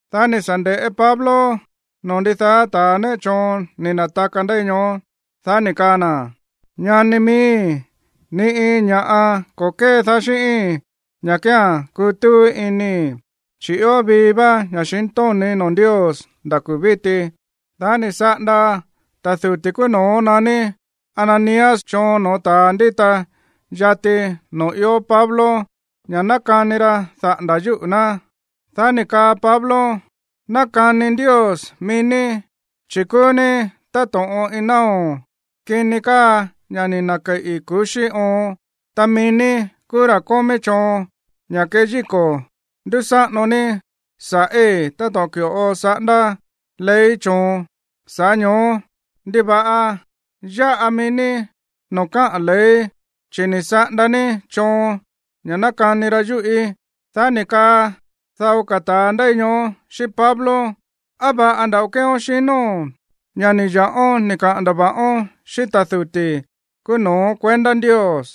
Dá ni̱ sa̱ nde̱ꞌé Pablo noo̱ ndidaá ta̱ néꞌe choon ni̱ na̱taka ndéi ñoó, dá ni̱ kaa na̱: ―Ñani miíi̱, ni iin ña̱ꞌa ko̱ kédaá xíꞌíi̱n ña̱ kía̱n kútúú inii̱, chi̱ ió vii vá ña̱xintóni̱í noo̱ Ndios nda̱ kuu̱ víti. Dá ni̱ saꞌanda ta̱ duti̱ kúú no̱ó naní Ananías choon no̱ó ta̱a ndíta yati noo̱ íin Pablo ña̱ ná kani ra daꞌa̱nda̱ yúꞌu̱ ná. Dá ni̱ kaa Pablo: ―Ná kani Ndios mií ní, chi̱ kúú ní táto̱ꞌon iin náo̱ kini káa ña̱ ni̱ na̱keꞌi kuxí oon. Ta mií ní kúú ra̱ kómí choon ña̱ keyíko̱ ndúsáꞌano ní sa̱ꞌí táto̱ꞌon ki̱ꞌo saꞌándá ley choon. Sa̱ꞌá ño̱ó, ¿ndiva̱ꞌa yáꞌa mií ní noo̱ káꞌa̱n ley, chi̱ ni̱ saꞌanda ní choon ña̱ ná kani ra yúꞌí? Dá ni̱ kaa dao ka̱ ta̱a ndéi ñoó xíꞌín Pablo: ―¿Á va̱ꞌa nda̱ꞌo kéeón xinóo̱n, ña̱ ni̱ ya̱ꞌón ni̱ kaꞌa̱n ndava̱ꞌón xíꞌín ta̱ duti̱ kúú no̱ó kuendá Ndios?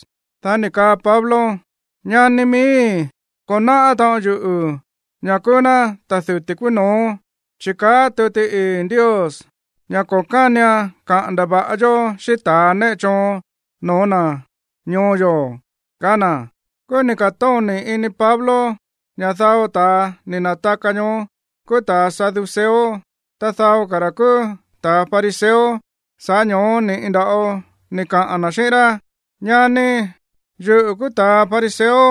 Dá ni̱ kaa Pablo: ―Ñani miíi̱, ko̱ náꞌá taꞌon yuꞌu̱ ña̱ kúú ná ta̱ duti̱ kúú no̱ó. Chi̱ káꞌa̱n tuti ii̱ Ndios ña̱ ko̱ kánian kaꞌa̱n ndava̱ꞌa yó xíꞌín ta̱a néꞌe choon no̱ó na̱ ñoo yo̱ ―kaá na̱. Kúú ni̱ ka̱tóni̱ ini Pablo ña̱ dao ta̱a ni̱ na̱taka ñoó kúú ta̱a saduceo, ta dao ka̱ ra̱ kúú ta̱a fariseo. Sa̱ꞌá ño̱ó ni̱ꞌi nda̱ꞌo ni̱ kaꞌa̱n na̱ xíꞌín rá: ―Ñani, yuꞌu̱ kúú ta̱a fariseo.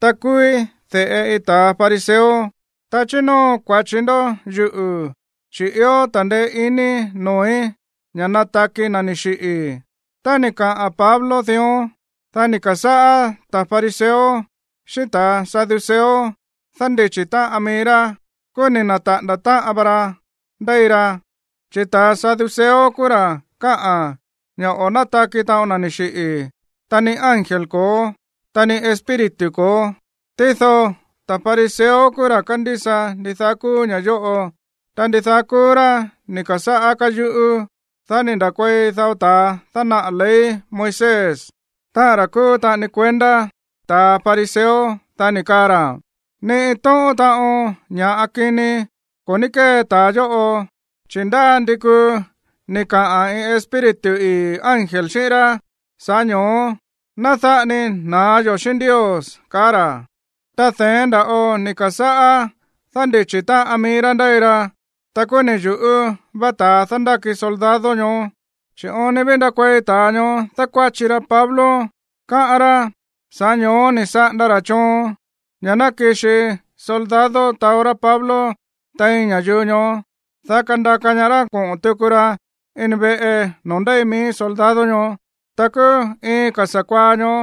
Ta kúúí de̱ꞌe iin ta̱a fariseo. Ta chínóo kua̱chi ndo̱ yuꞌu̱ chi̱ ió ta̱ndeé iní noo̱í ña̱ nataki na̱ ni̱ xiꞌi̱. Tá ni̱ kaꞌa̱n Pablo dión, dá ni̱ ka̱sáꞌá ta̱a fariseo xíꞌín ta̱a saduceo dándichi̱ táꞌan mií rá. Kúú ni̱ na̱taꞌa̱nda̱ táꞌan va ra ndéi ra. Chi̱ ta̱a saduceo kúú ra̱ káꞌa̱n ña̱ o̱ nátaki taꞌon na̱ ni̱ xiꞌi̱, ta ni ángel ko̱ó, ta ni espíritu ko̱ó. Tído ta̱ fariseo kúú ra̱ kándísa ndidaá kúú ña̱ yóꞌo. Ta ndidaá kúú rá ni̱ ka̱sáꞌá káyuꞌú. Dá ni̱ nda̱kuei dao ta̱a dánaꞌa̱ ley Moisés, táꞌa̱n ra̱ kúú taꞌani kuendá ta̱ fariseo. Dá ni̱ kaa ra̱: ―Ni iin tóꞌón taꞌon ña̱ꞌa kini ko̱ ní kée ta̱a yóꞌo, chi̱ ndá ndi kuu ni̱ kaꞌa̱n iin espíritu o iin ángel xíꞌín rá. Sa̱ꞌá ño̱ó ná dáꞌa ni na̱á yo̱ xíꞌín Ndios ―kaá ra̱. Ta de̱én nda̱ꞌo ni̱ ka̱sáꞌá dándichi̱ táꞌan mií rá ndéi ra. Ta kúú ni̱ yu̱ꞌú va ta̱a dándáki soldado ñoó, chi̱ oon ni ví ndakuei ta̱a ñoó dákuáchi ra Pablo, káꞌán rá. Sa̱ꞌá ño̱ó ni̱ saꞌanda ra̱ choon ña̱ ná kixi soldado taó rá Pablo tein ña̱yuu ñoó, dá kandaka ñaá rá koꞌo̱n tuku ra ini veꞌe noo̱ ndéi mií soldado ñoó. Ta kúú iin ka̱ sa̱kuaá ñoó,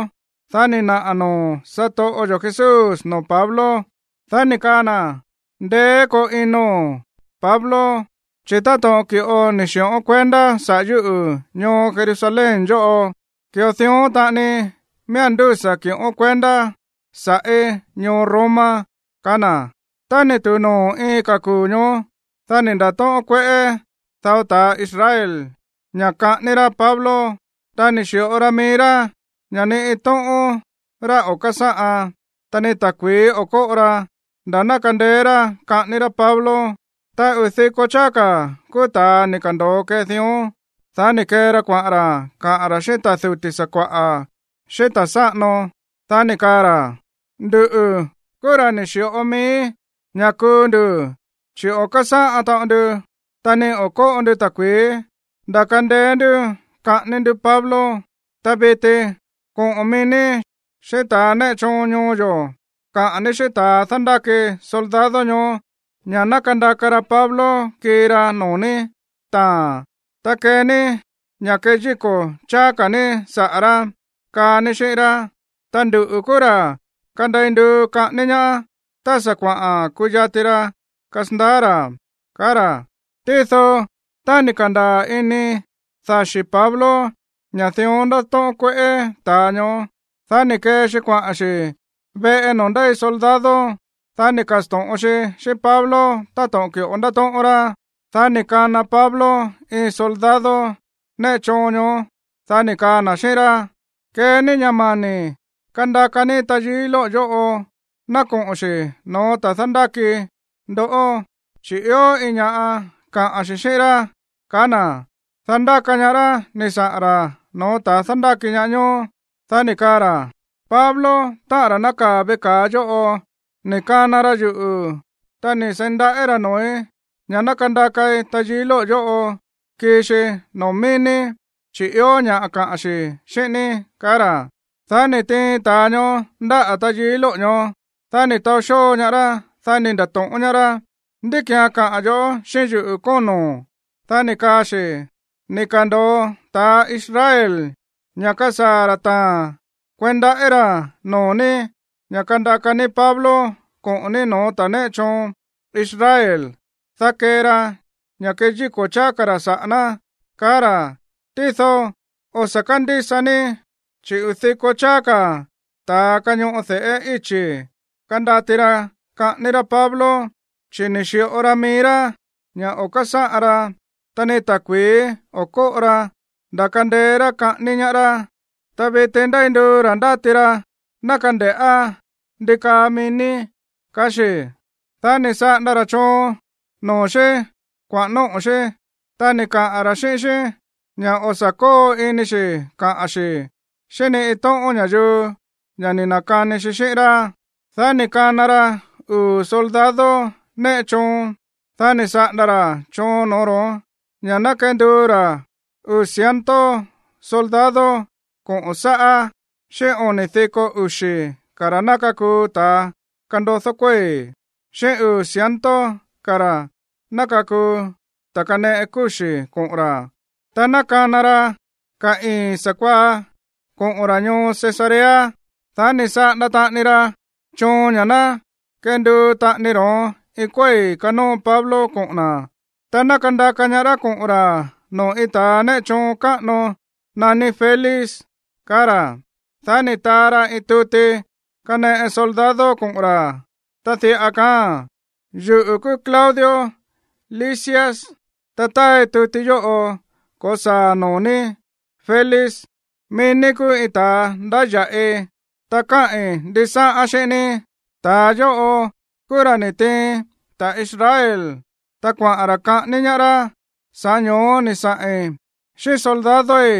dá ni̱ naꞌa̱ noo̱ satoꞌo yo̱ Jesús noo̱ Pablo. Dá ni̱ kaa na̱: ―Ndeé koo inóo̱n, Pablo. Chi̱ táto̱ꞌon ki̱ꞌo ni̱ xi̱ꞌón kuendá saꞌa̱ yúꞌu̱ ñoo Jerusalén yóꞌo, ki̱ꞌo dión taꞌani miía̱n ndúsa̱ ki̱ꞌón kuendá sa̱ꞌí ñoo Roma ―kaá na̱. Tá ni̱ tu̱u noo̱ iin ka̱ kuu̱ ñoó, dá ni̱ nda̱tóꞌón kueꞌé dao ta̱ Israel ña̱ kaꞌání rá Pablo. Ta ni̱ xi̱ꞌo ra mií rá ña̱ ni iin tóꞌón rá o̱ kásáꞌan, ta ni ta̱kui̱í o̱ kóꞌo ra nda̱ ná kandeé rá kaꞌání rá Pablo. Ta uu̱ diko cháá ka̱ kúú ta̱a ni̱ ka̱ndo̱o kee dión. Dá ni̱ kee ra kuaꞌa̱n ra̱ kaꞌa̱n ra̱ xíꞌín ta̱ duti̱ sakua̱ꞌa̱, xíꞌín ta̱ sáꞌano, dá ni̱ kaa ra̱: ―Nduꞌu̱ kúú ra̱ ni̱ xi̱ꞌo mií ña̱ kuu ndu̱, chi̱ o̱ kásáꞌan taꞌon ndu ta ni o̱ kóꞌo ndu ta̱kui̱í nda̱ kandeé ndú kaꞌání ndú Pablo. Ta viti, koꞌo̱n mií ní xíꞌín ta̱ néꞌe choon ñoo yo̱ kaꞌa̱n ní xíꞌín ta̱a dándáki soldado ñoó ña̱ ná kandaka ra Pablo kii ra noo̱ ní taa̱n, ta kee ní ña̱ keyíko̱ cháá ka̱ ní saꞌa̱ rá, kaa ní xíꞌín rá. Ta nduꞌu̱ kúú ra̱ kandei nduu kaꞌání ñaá tá sa̱ kuaꞌa̱n kuyati ra kasandaá ra̱ ―kaá ra̱. Tído tá ni̱ ka̱ndaa̱ ini daxi̱ Pablo ña̱ dión ndátóꞌón kueꞌé ta̱a ñoó, dá ni̱ kee xi kuaꞌa̱n xi̱ veꞌe noo̱ ndéi soldado. Dá ni̱ ka̱sto̱ꞌon xi xíꞌín Pablo táto̱ꞌon ki̱ꞌo ndátóꞌón rá. Dá ni̱ kana Pablo iin soldado néꞌe choon ñoó. Dá ni̱ kaa na̱ xíꞌín rá: ―Kee ní ña̱ mani̱ kandaka ní tayií lóꞌo̱ yóꞌo ná koꞌo̱n xi̱ no̱ó ta̱a dándáki ndoꞌó, chi̱ ió iin ña̱ꞌa kaꞌa̱n xi̱ xíꞌín rá ―kaá na̱. Dá ndáka ñaá rá ni̱ saꞌa̱n ra̱ no̱ó ta̱a dándáki ñaá ñoó. Dá ni̱ kaa ra̱: ―Pablo, táꞌa̱n ra̱ nákaa̱ veꞌe ka̱a yóꞌo, ni̱ kana ra yuꞌu̱, ta ni̱ seí ndaꞌí ra̱ noo̱í ña̱ ná kandakai tayií lóꞌo̱ yóꞌo kii xi noo̱ mií ní, chi̱ ió ña̱ kaꞌa̱n xi̱ xíꞌín ní ―kaá ra̱. Dá ni̱ tiin ta̱a ñoó ndáꞌa̱ tayií lóꞌo̱ ñoó. Dá ni̱ taó xóo ñaá rá. Dá ni̱ nda̱to̱ꞌón ñaá rá: ―¿Ndí ki̱án kaꞌa̱n yo̱ꞌó xíꞌín yuꞌu̱, kóno̱n? Dá ni̱ kaa xi̱: ―Ni̱ ka̱ndo̱o ta̱ Israel ña̱ kasaa̱ ra̱ taa̱n kueí ndaꞌí ra̱ noo̱ ní ña̱ kandaka ní Pablo koꞌo̱n ní no̱ó ta̱ néꞌe choon Israel, dá kee ra ña̱ keyíko̱ cháá ka̱ ra̱ saꞌa̱ ná, kaa ra̱. Tído, o̱ sa̱ kándísa ní, chi̱ uu̱ diko cháá ka̱ ta̱a kañoꞌo de̱ꞌé íchi̱ kandati ra kaꞌání rá Pablo, chi̱ ni̱ xi̱ꞌo ra mií rá ña̱ o̱ kásáꞌan ra ta ni ta̱kui̱í o̱ kóꞌo ra nda̱ kandeé rá kaꞌání ñaá rá. Ta viti ndéi nduu ra̱ ndáti ra ná kande̱ꞌá ndi kaa mií ní ―kaá xi̱. Dá ni̱ saꞌanda ra̱ choon noo̱ xí kuaꞌa̱n nóꞌo̱ xí, ta ni̱ kaꞌa̱n ra̱ xíꞌín xí ña̱ o̱ sa̱ kóo ini xi̱ kaꞌa̱n xi̱ xíꞌín ni iin tóꞌón ña̱yuu ña̱ ni̱ na̱kani xi xíꞌín rá. Dá ni̱ kana ra uu̱ soldado néꞌe choon. Dá ni̱ saꞌanda ra̱ choon noo̱ ro̱ón ña̱ ná kenduu ra̱ uu̱ ciento soldado koꞌo̱n sáꞌá, xíꞌín oni̱ diko uxi̱ ka̱ ra̱ ná kakuu ta̱ kandodó kuéi̱, xíꞌín uu̱ ciento ka̱ ra̱ ná kakuu ta̱ kaneꞌe kúxi̱ koꞌo̱n ra̱, ta ná kana ra ka̱ ii̱n sa̱kuaá koꞌo̱n ra̱ ñoo Cesarea. Dá ni̱ saꞌanda taꞌani ra choon ña̱ ná kenduu taꞌani ro̱ón iin kuéi̱ kanóo Pablo koꞌo̱n na̱, ta ná kandaka ñaá rá koꞌo̱n ra̱ noo̱ iin ta̱ néꞌe choon káꞌano naní Félix, kaá ra̱. Dá ni̱ taa ra iin tuti kaneꞌe soldado koꞌo̱n ra̱, ta diꞌa kaáa̱n: “Yuꞌu̱ kúú Claudio Lisias, ta táai tuti yóꞌo ko̱saa̱ noo̱ ní, Félix. Mií ní kúú iin ta̱a ndáya̱ꞌi, ta káꞌi̱n ndisáꞌán xíꞌín ní. Ta̱a yóꞌo kúú ra̱ ni̱ tiin ta̱ Israel, ta kuaꞌa̱n ra̱ kaꞌání ñaá rá. Sa̱ꞌá ño̱ó ni̱ saꞌi̱n xíꞌín soldadoi̱,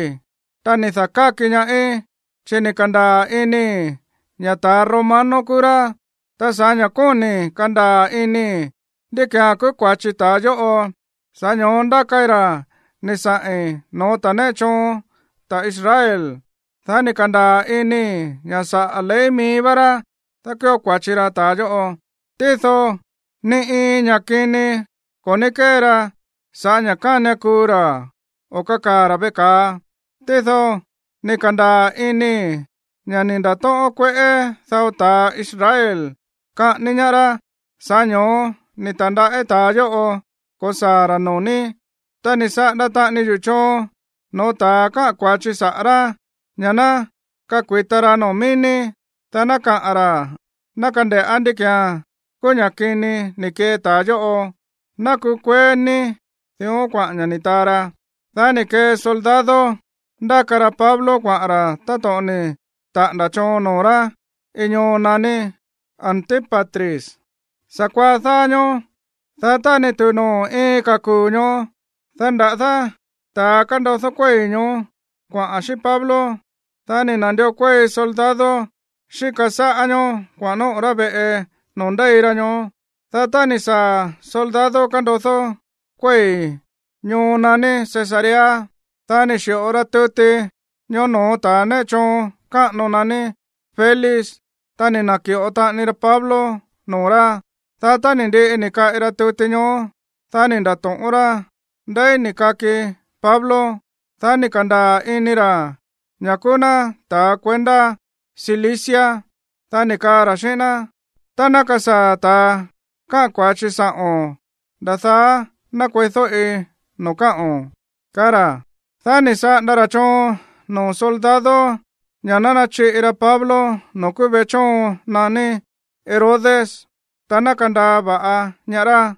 ta ni̱ da̱káki ñaáí, chi̱ ni̱ ka̱ndaa̱ inii̱ ña̱ ta̱ romano kúú rá. Ta sa̱ꞌá ña̱ kóni̱i̱ kandaa̱ inii̱ ndí ki̱án kúú kua̱chi ta̱a yóꞌo, sa̱ꞌá ño̱ó ndákai ra̱ ni̱ saꞌi̱n no̱ó ta̱ néꞌe choon ta̱ Israel. Dá ni̱ ka̱ndaa̱ inii̱ ña̱ saꞌa̱ ley mií vá rá dákuío kua̱chi ra̱ ta̱a yóꞌo. Tído ni iin ña̱ꞌa kini ko̱ ní kée ra sa̱ꞌá ña̱ kánian kuu ra̱ o kakaa̱ ra̱ veꞌe ka̱a. Tído ni̱ ka̱ndaa̱ inii̱ ña̱ ni̱ nda̱tóꞌón kueꞌé dao ta̱ Israel kaꞌání ñaá rá. Sa̱ꞌá ño̱ó ni̱ ta̱ndaꞌí ta̱a yóꞌo ko̱saa̱ ra̱ noo̱ ní. Ta ni̱ saꞌanda taꞌani yuꞌu̱ choon no̱ó ta̱a káꞌa̱n kua̱chi saꞌa̱ rá ña̱ ná kakui̱ta ra noo̱ mií ní, dá ná kaꞌa̱n ra̱, ná kande̱ꞌá ndí ki̱án kúú ña̱ kini ni̱ kee ta̱a yóꞌo. Ná kukueé ní.” Dión kuaꞌa̱n ña̱ ni̱ taa ra. Dá ni̱ kee soldado ndáka ra Pablo kuaꞌa̱n ra̱ táto̱ꞌon ni̱ taꞌa̱nda̱ choon noo̱ rá iin ñoo naní Antípatris sa̱kuaá dáá ñóó. Dá tá ni̱ tu̱u noo̱ iin ka̱ kuu̱ ñoó, dá nda̱dá ta̱ kándodó kuéi̱ ñoó kuaꞌa̱n xíꞌín Pablo, dá ni̱ na̱ndió kuéi soldado xíka sáꞌá ñoó kuaꞌa̱n nóꞌo̱ rá veꞌe noo̱ ndéi ra ñoó. Dá tá ni̱ saa̱ soldado kándodó kuéi̱ ñoo naní Cesarea, dá ni̱ xi̱ꞌo ra tuti ñoó no̱ó ta̱ néꞌe choon káꞌano naní Félix. Ta ni̱ na̱ki̱ꞌo taꞌani ra Pablo noo̱ rá. Dá tá ni̱ ndiꞌi ni̱ kaꞌi ra tuti ñoó, dá ni̱ nda̱to̱ꞌón rá ndeí ni̱ kaki Pablo. Dá ni̱ ka̱ndaa̱ ini ra̱ ña̱ kúú ná ta̱ kuendá Cilicia. Dá ni̱ kaa ra̱ xíꞌín ná: ―Tá ná kasaa̱ ta̱a káꞌa̱n kua̱chi sa̱ꞌo̱n, nda̱ daá ná kueídóꞌi noo̱ káꞌo̱n ―kaá ra̱. Dá ni̱ saꞌanda ra̱ choon noo̱ soldado ña̱ ná nachiꞌi ra Pablo noo̱ kúú veꞌe chóon naní Herodes, ta ná kandaa va̱ꞌa ñaá rá.